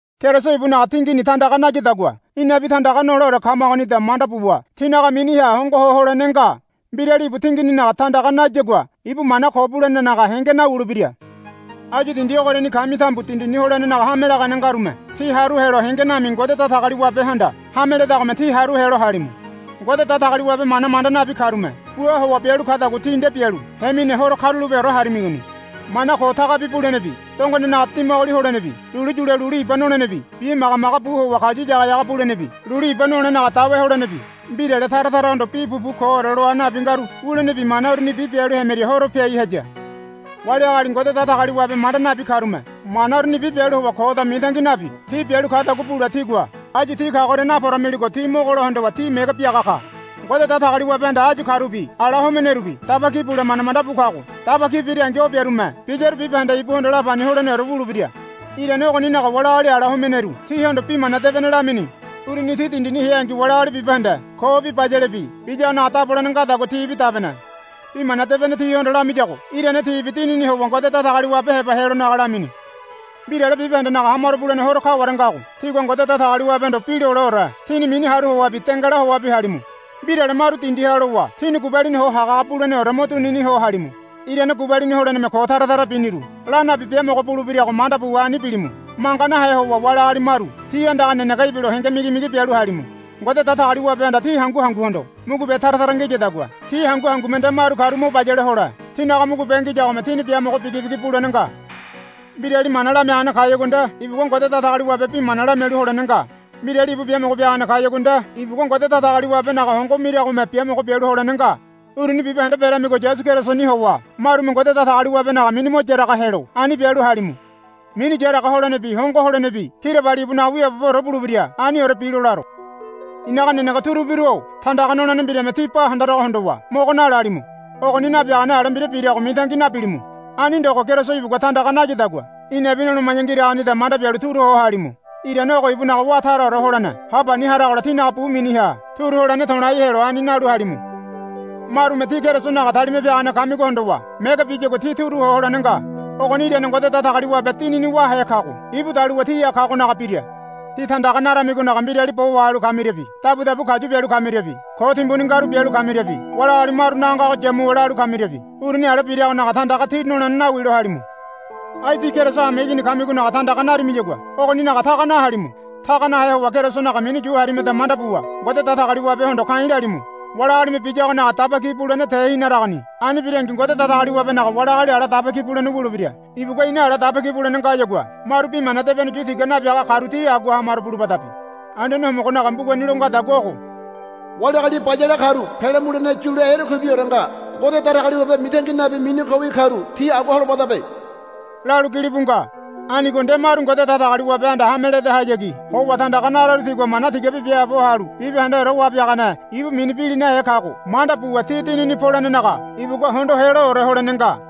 Keriso ibunaga tingini tandaga nayadagua inabi tandaga noleore kamagonida manda buwa tínaga miniha hongoho holene nga. Mbirali ibu tingininaga tandaga nayagua ibu mana ko bulenenaga henge nawulebira. Áyu dindi ogoriani kami tambu dindini holenenaga hame lagane ngarume tí haru helo henge nami Ngode Datagaliwabehanda hame ledagome tí haru helo halimu. Ngode Datagaliwabe mana manda nabi karume bua howa bialu kadagua tí nde bialu hemine horo karulapeore harimigoni. Mana ko tagabi bulenebi dongonenaga dimagoli holenebi lulu yule lulu iba nolenebi bimagamaga bu howa kayu yagayaga bulenebi lulu iba nolenaga dawe holenebi mbirale tara tarahondo bi pupu koore loa nabi ngaru wulenebi mana urunibi bialu hemiria horo piai haya. Wali agali Ngode Datagaliwabe manda nabi karume mana urunibi bialu howa koda mitangi nabi ti bialu kadagua bule tígua áyu ti kagoria naporamiligo ti mogolo hondowa tí mege biaga ka. Ngode Datagaliwabehanda áyu karubi ala homenerubi daba ki bule manda manda bu kago daba ki birangi o biarume biyaru bibahende ibuhondo lapani holeneore wulebira. Irane ogoninaga wali agali ala homeneru tihondo Bi Mana Debene lamini. Uruni ti dindini heangi wali agali bibahende kobi bayalebi biyagonaga dabolene ngadagua tibi dabene. Bi Mana Debene tihondo lamiyago irane tibi dinini howa Ngode Datagaliwabe heba helonaga lamini. Mbirale bibahendenaga hamaro bulene horo kaware ngago tígua Ngode Datagaliwabehondo bi loleore tíni mini haru howabi dengala howabi halimu. Mbirale maru dindiha lowa tíni gubalini ho hagahaga buleneore mo dunini ho halimu. Irane gubalini holeneme ko tara tara biniru la nabi biamogo bulebirago manda buwa ani bilimu. Manga nahe howa wali agali maru tí andaga nenege ibilo henge migimigi bialu halimu. Ngode Datagaliwabehanda tí hangu hanguhondo mugube tara tara ngiyadagua tí hangu hangume nde maru karu mo bayale hole tínaga mugube ngiyagome tíni biamogo bigibigi bulene nga. Mbirali mana lamiagane kayagua nde ibugua Ngode Datagaliwabe bi mana lamialu holene nga. Mbirali ibu biamogo biagane kayagua nde ibugua Ngode Datagaliwabenaga hongo miragome biamogo bialu holene nga. Uruni bibahende beramigo Yasu Kerisoni howa marume Ngode Datagaliwabenaga mini mo yaraga helo ani bialu halimu. Mini yaraga holenebi hongo holenebi kirabali ibunaga wiaaboboore bulebira. Aniore bilo laro. I̱naga nenege turubiru-o tandaga nolene mbirame tí ba handarago hondowa mogo nalalimu. Ogoni nabiagane ale mbira birago mitangi nabilimu. Ani ndogo Keriso ibugua tandaga nayadagua inabi noloma̱ya ngiragonida manda bialu turu ho halimu. Irane ogo ibunaga wá taraore holene ha pani haragola tínaga bu miniha turu holene to̱lai helo ani nalu halimu. Marume tí Kerisonaga talima piagane kamigo hondowa mege biyagua tí turu ho holene nga. Ogoni irane Ngode Datagaliwabe Dinini wáhe kago ibu daluwa tíha kagonaga bira. Tí tandaga naramigonaga mbirali bo wahalu kamiriabi dabudabu kayu bialu kamiriabi ko timbuni ngaru bialu kamiriabi wali agali marunaga ngago yamuwa lalu kamiriabi uruni ale birimigonaga tandaga tí nolene nawilo halimu. Ai tí Keriso hameigini kamigonaga tandaga narimiyagua ogoninaga taga nahalimu. Taga nahe howa Kerisonaga mini yu harimada manda buwa Ngode Datagaliwabehondo ka̱i̱ lalimu. Wali agalime biyagonaga daba ki bulene tehinaragoni. Ani birangi Ngode Datagaliwabenaga wali agali ala daba ki bulene wulebira. Ibugua ina ala daba ki bulene ngayagua maru Bi Mana Debene yu tiga nabiaga karu ti agua hamaro bulubadabe. Anduane Homogonaga mbugani lo ngadagua ogo, Wali agali bayale karu pele mulene yule erekuibiore nga. Ngode Datagaliwabe mitangi nabi mini kowi karu ti agua holobadabe, lalu gilibu nga. Anigo nde maru Ngode Datagaliwabehanda hame ledahayagi howa tandaga nararu tigua mana tigabi biaabo halu bibahendeore Wabiagane ibu mini bilinahe kago manda buwa ti dinini polenenaga ibugua hondo heloore holene nga.